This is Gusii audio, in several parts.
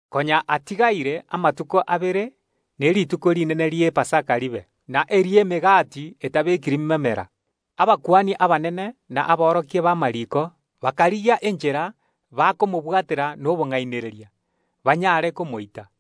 Konya atigaire amatuko abere ne rituko rinene ri’Epasaka ribe, na eri ’Emegati etabekiri memera. Abakuani abanene na aborokia b’amariiko bakarigia enchera bakobwatera Yeso nobong’ainereria, banyare komoita,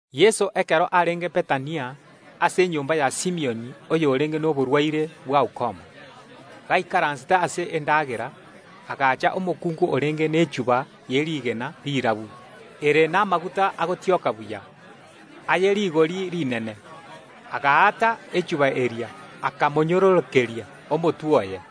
Yeso nigo arenge Bethania ase enyomba ya Simioni oyorenge noborwaire bwa ukoma. Ekero Yeso aikaransire ase endagera, omokungu agacha orenge nechuba ye rigena rirabu ere namaguta agotioka buya, aye rigori rinene, agaata echuba eria, akamonyororokeria omotwe oye.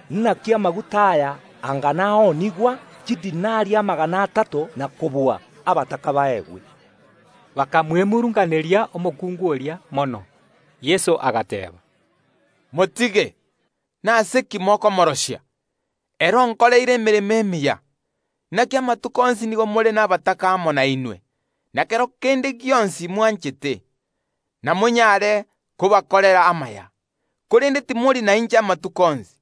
Inaki amaguta aya anga naoonigwa chidinari amagana atato na kobua, abataka baegwe.” Bakamwemurunganeria omokungu oria mono. Yeso agateeba, “Motige! Nase ki mokomorosia? Ere onkoreire emeremo emiya. Inaki amatuko onsi nigo more nabataka amo nainwe, na kero kende gionsi mwanchete, namonyare kobakorera amaya, korende timori nainche amatuko onsi.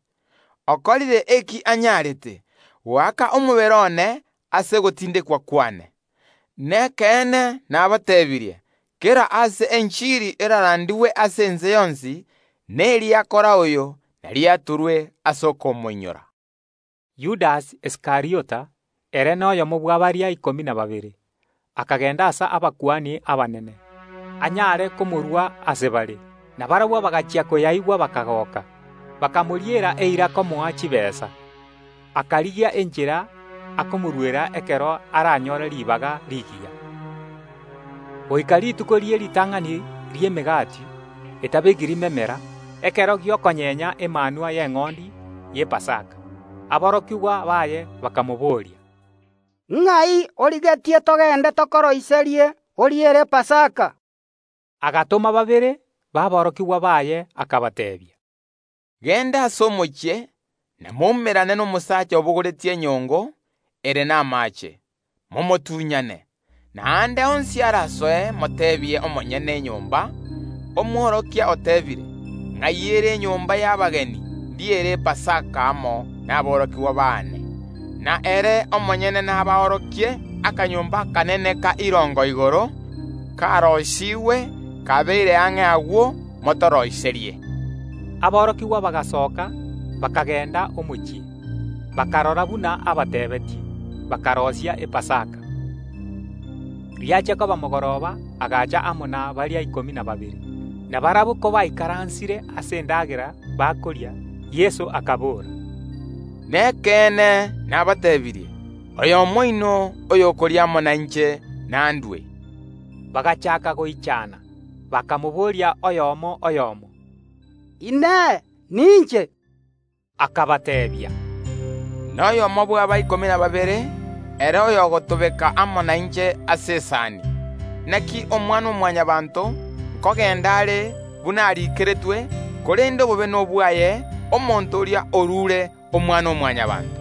Okorire eki abuete, goaka omobere one ase ogotindekwa kwane. Nekeene nabateebirie: Kera aase enchiri erarandigwe ase ense yonsi, neri akora oyo nariatorwe ase okomoinyora.” Yudasi Iskariota, ere noyomo bwa baria ikomi na babere, akagenda ase abakuani abanene, anyare komorua ase bare. Na barabwo bagachia koyaigwa bakagoka, bakamoriera eira komoa chitaabu. Akarigia enchera akomoruera ekero aranyore ribaga rigiya. Goika rituko rie ritang’ani ri’Emegati etabekiri memera, ekero gi’okonyenya emanwa y’eng’ondi y’Epasaka, aborokigwa baye bakamobooria, “Ng’ai origetie togende tokoroiserie oriere Epasaka?” Erio Yeso agatoma babere baborokigwa baye akabateebia, “Genda ase omochie na moumerane nomosaacha obogoretie enyongo ere namaache; momotuny’ane, na aande onsi arasoe moteebie omonyene enyomba: Omworokia oteebire: Ng’ai ere enyomba y’abageni ndiere Epasaka amo naborokigwa baane? Na ere omonyene naborokie akanyomba akanene ka irongo igoro, karoisigwe kabeire ang’e; agwo motoroiserie.” Aborokigwa bagasoka, bakagenda omochie, bakarora buna abateebetie, bakaroisia Epasaka. Ekero riaba mogoroba agacha amo na baria ikomi na babere. Na barabwo kobaikaransire ase endagera bakoria, Yeso akabora, “Nekeene, nabateebirie: Oyomo oino oyokoria amo nainche nandue.” Aborokigwa baye bagachaaka goichana, bakamobooria oyomo ase oyomo “Inee! Ninche?” Akabateebia, “Noyomo bw’aba ikomi na babere, ere oyogotobeka amo nainche omogati ase esani. Inaki Omwana-o-Mwanyabaanto nkogenda are buna ariikeretwe korende obobe nobwaye omonto oria orure Omwana-o-Mwanyabaanto.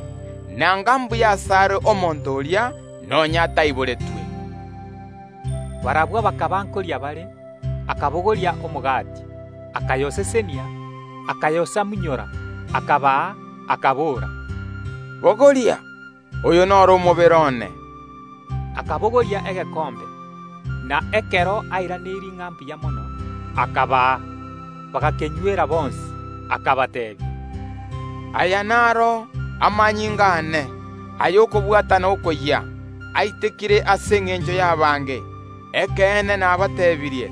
Nanga mbuya ase are omonto oria, nonya ataiboretwe.” Ekero barenge koria, Yeso akabogoria omogati, akayosesenia, akayosamunyora, akaa aborokigwa baye, akabora, “Bogoria! Oyo noro omobere one.” Akabogoria egekombe, na ekero airaneirie ng’a mbuya mono, akabaa. Bagakenywera bonsi. Akabateebia, “Aya naro amanyinga aane, ay’okobwatana okoyia, aitekire ase engencho y’abange. Ekeene nabateebirie: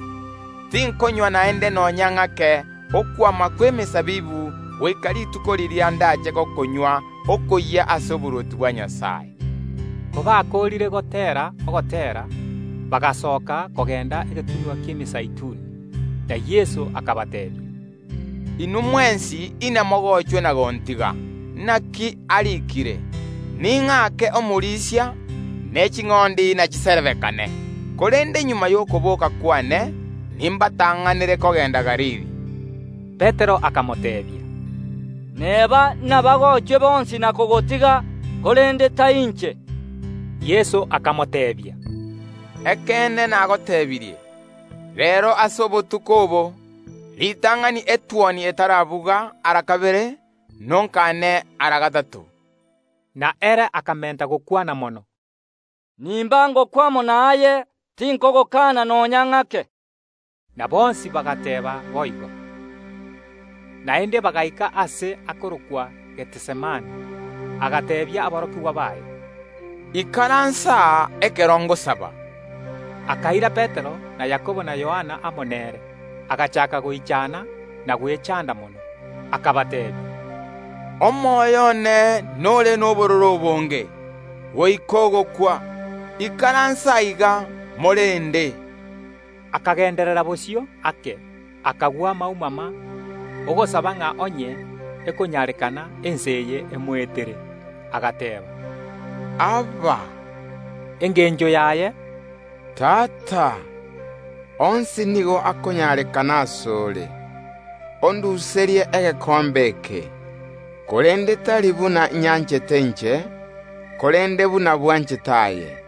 Tinkonywa naende nonya ng’ake okwama kw’emesabibu goika rituko riria ndache gokonywa okoyia ase oborwoti bwa Nyasae.” Kobakoorire goteera Ogoteera, bagasoka kogenda egetunwa ki’Emezeituni. Na Yeso agateebia aborokigwa baye, “Inwe mwensi inamogochwe na gontiga, naki nariikire: Ning’ake omorisia, ne ching’ondi nachiserebekane. Korende magega y’okobooka kw’ane, nimbatang’anere kogenda Galili.” Petero akamoteebia, “Neba imbagochwe bonsi na kogotiga, korende tari inche.” Yeso akamoteebia, “Ekeene nagotebirie: Reero, ase obotuko obo, ritang’ani etuoni etarabuga ara kabere, nonkane ara gatato.” Korende Petero ere akamenta gokwana mono, “Nimba ngokwa amo naye, tinkogokana nonya ng’ake.” Na bonsi bagateeba boigo. Naende bagaika aase akorokwa Gethisemane: Yeso agateebia aborokigwa baye, “Ikaransa aa, ekero ngosaba.” Akaira Petero na Yakobo na Yohana amo nere, agachaaka goichana na gwechanda mono. Akabateebia, “Omoyo one nore nobororo obonge, goika ogokwa; ikaransa aiga, morende.” Akagenderera bosio ake, akagwa maumama, ogosaba ng’a onye ekonyarekana, ensa eye emoetere. Agateeba, Abba! Engencho yaye “Tata”, onsi nigo akonyarekana ase ore, onduserie egekombe eke, korende tari buna nyanchete inche, korende buna bwanchete aye.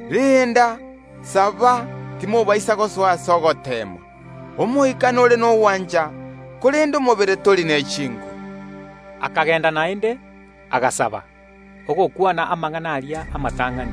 Renda, saba, timobaisa gosoa ase ogoteemwa; omoika nore nogwancha, korende omobere tori ne chinguru.” Akagenda naende, agasaba, ogokwana amang’ana aria amatang’ani.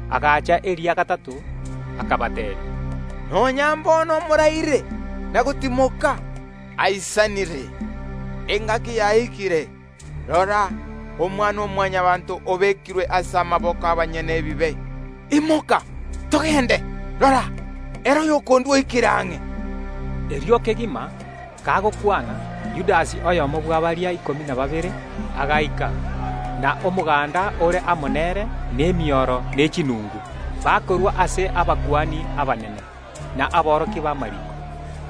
Agacha eria gatato, akabateebia, “Nonya mbono moraire, na gotimoka? Aisanire. Engaki yaikire. Rora, Omwana-o-Mwanyabaanto obekirwe ase amaboko y’abanyene ebibe. Imoka, togende; rora, ere oyokondua oikire ang’e.” Erio kegima Yeso kagokwana, Yudasi, oyomo bwa baria ikomi na babere, agaika, na omoganda ore amo nere nemioro ne chinungu, bakorwa ase abakuani abanene, na aborokia b’amariiko,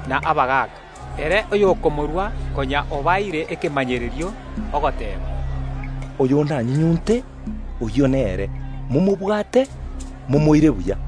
na abagaaka. Ere oyokomorua konya obaeire ekemanyererio, ogoteeba, “Oyo ndanyunyunte, oyio nere, momobwate, momoire momorendete.”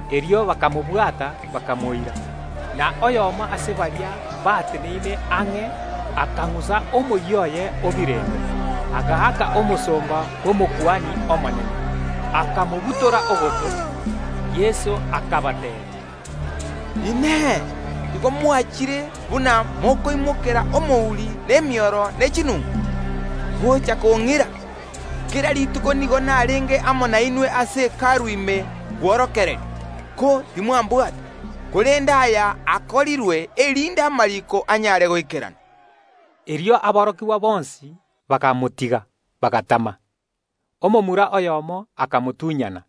Erio bakabwata Yeso, bakamoira. Na oyomo ase baria bateneine ang’e akang’usa omoyio oye o birende, agaaka omosomba bw’Omokuani omonene, akamobutora ogoto. Yeso akabateebia, “Inee! Igo mwachire buna mokoimokera omouri nemioro ne chinungu, gocha kong’ira? Inarenge amo nainwe kera rituko ase Hekalu ime kworokereria, ko timwambwata. Korende aya akorirwe, erinde amariiko anyare goikerana.” Erio aborokigwa bonsi bakamotiga, bagatama. Omomura oyomo akamotunyana,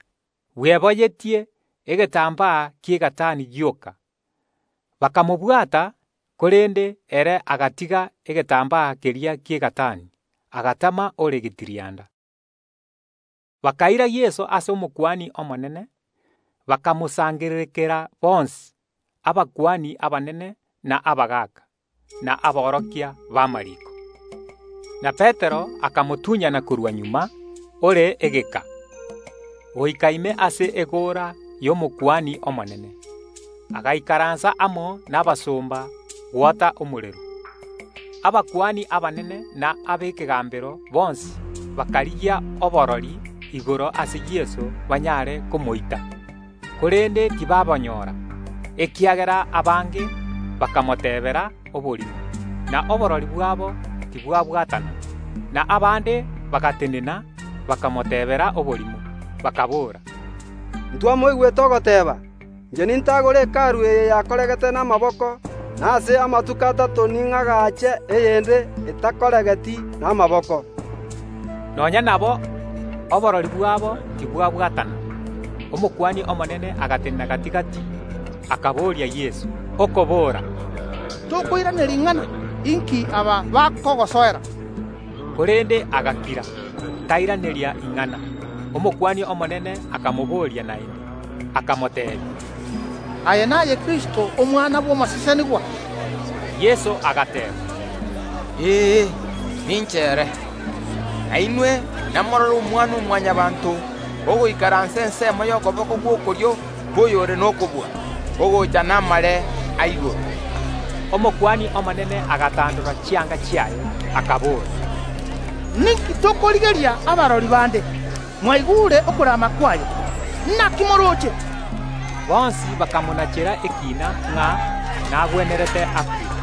bweboyetie egetambaa ki’egatani gioka. Bagatema kamobwata, korende ere agatiga egetambaa keria ki’egatani, agatama ore getirianda. Bakaira Yeso ase Omokuani omonene; bakamosangererekanera bonsi, abakuani abanene na abagaaka, na aborokia b’amariiko. Na Petero akamotunyana korwa magega ore egeka, goika ime ase egoora y’Omokuani omonene, agaikaransa amo nabasomba gwota omorero. Abakuani abanene na ab’ekegambero bonsi bakarigia oborori igoro ase Yeso banyare komoita, korende tibabonyora, ekiagera abange bakomoteebera oborimo, na oborori bwabo tibwabwatana. Na abande bagatenena bakamoteebera oborimo, bakaboora, “Ntwamoigwete ogoteeba: Inche nintagore Hekalu eye yakoregete n’amaboko, na ase amatuko atato ning’agache eyende etakoregeti n’amaboko.” Nonya nabo oborori bwabo tibwabwatana. Omokuani omonene agatenena gati‐gati, akaboria Yeso okobora, “Tokoiraneria ing’ana? Inki aba bakogosoera?” Korende agakira, tairaneria ing’ana. Omokuani omonene akamobooria naende, akamoteebia, “Aye naye Kristo, Omwana bw’Omosesenigwa?” Yeso agateeba, “Ee, ninche ere; na inwe namorore Omwana‐o‐Mwanyabaanto ogoikaransa ensemo y’okoboko gw’okorio kw’Oyore nokobua, ogocha namare a igoro.” Omokuani omonene agatandora chianga chiaye, akabora, “Ninki tokorigeria abarori bande? Mwaigure okorama kwaye. Inaki morooche?” Bonsi bakamonachera ekiina ng’a nagwenerete akwe.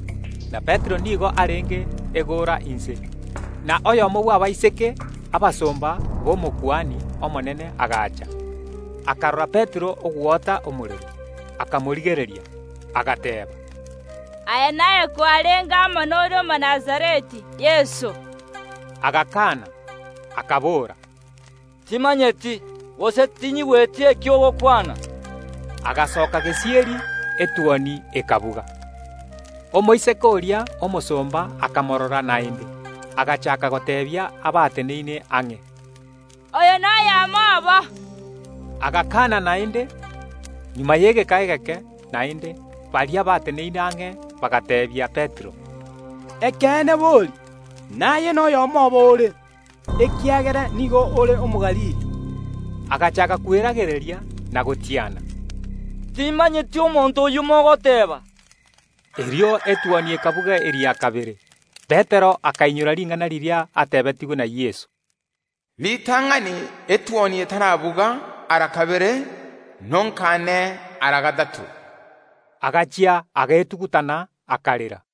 Na Petero nigo arenge egoora inse, na oyomo bw’abaiseke abasomba b’Omokuani omonene agacha, akarora Petero ogwota omorero, akamorigereria, agateeba, “Aye naye kwarenge amo noria Omonazareti, Yeso.” Agakana, akabora, “Timanyeti, gose tinyigweti eki ogokwana.” Agasoka gesieri; etuoni ekabuga. Omoiseke oria omosomba akamorora naende, agachaaka goteebia abateneine ang’e, “Oyo n’oyomo obo.” Agakaana naende. Magega y’egeka egeke naende, baria bateneine ang’e bagateebia Petero, “Ekeene bori, naye n’oyomo obo ore, ekiagera nigo ore Omogalili.” Agachaaka kweragereria na gotiana, “Timanyeti omonto oyio mogoteeba.” Erio etuoni ekabuga eria kabere. Petero akainyora ring’ana riria atebetigwe na Yeso, “Ritang’ani etuoni etarabuga ara kabere, nonkaane ara gatato.” Agachia agetugutana, akarera.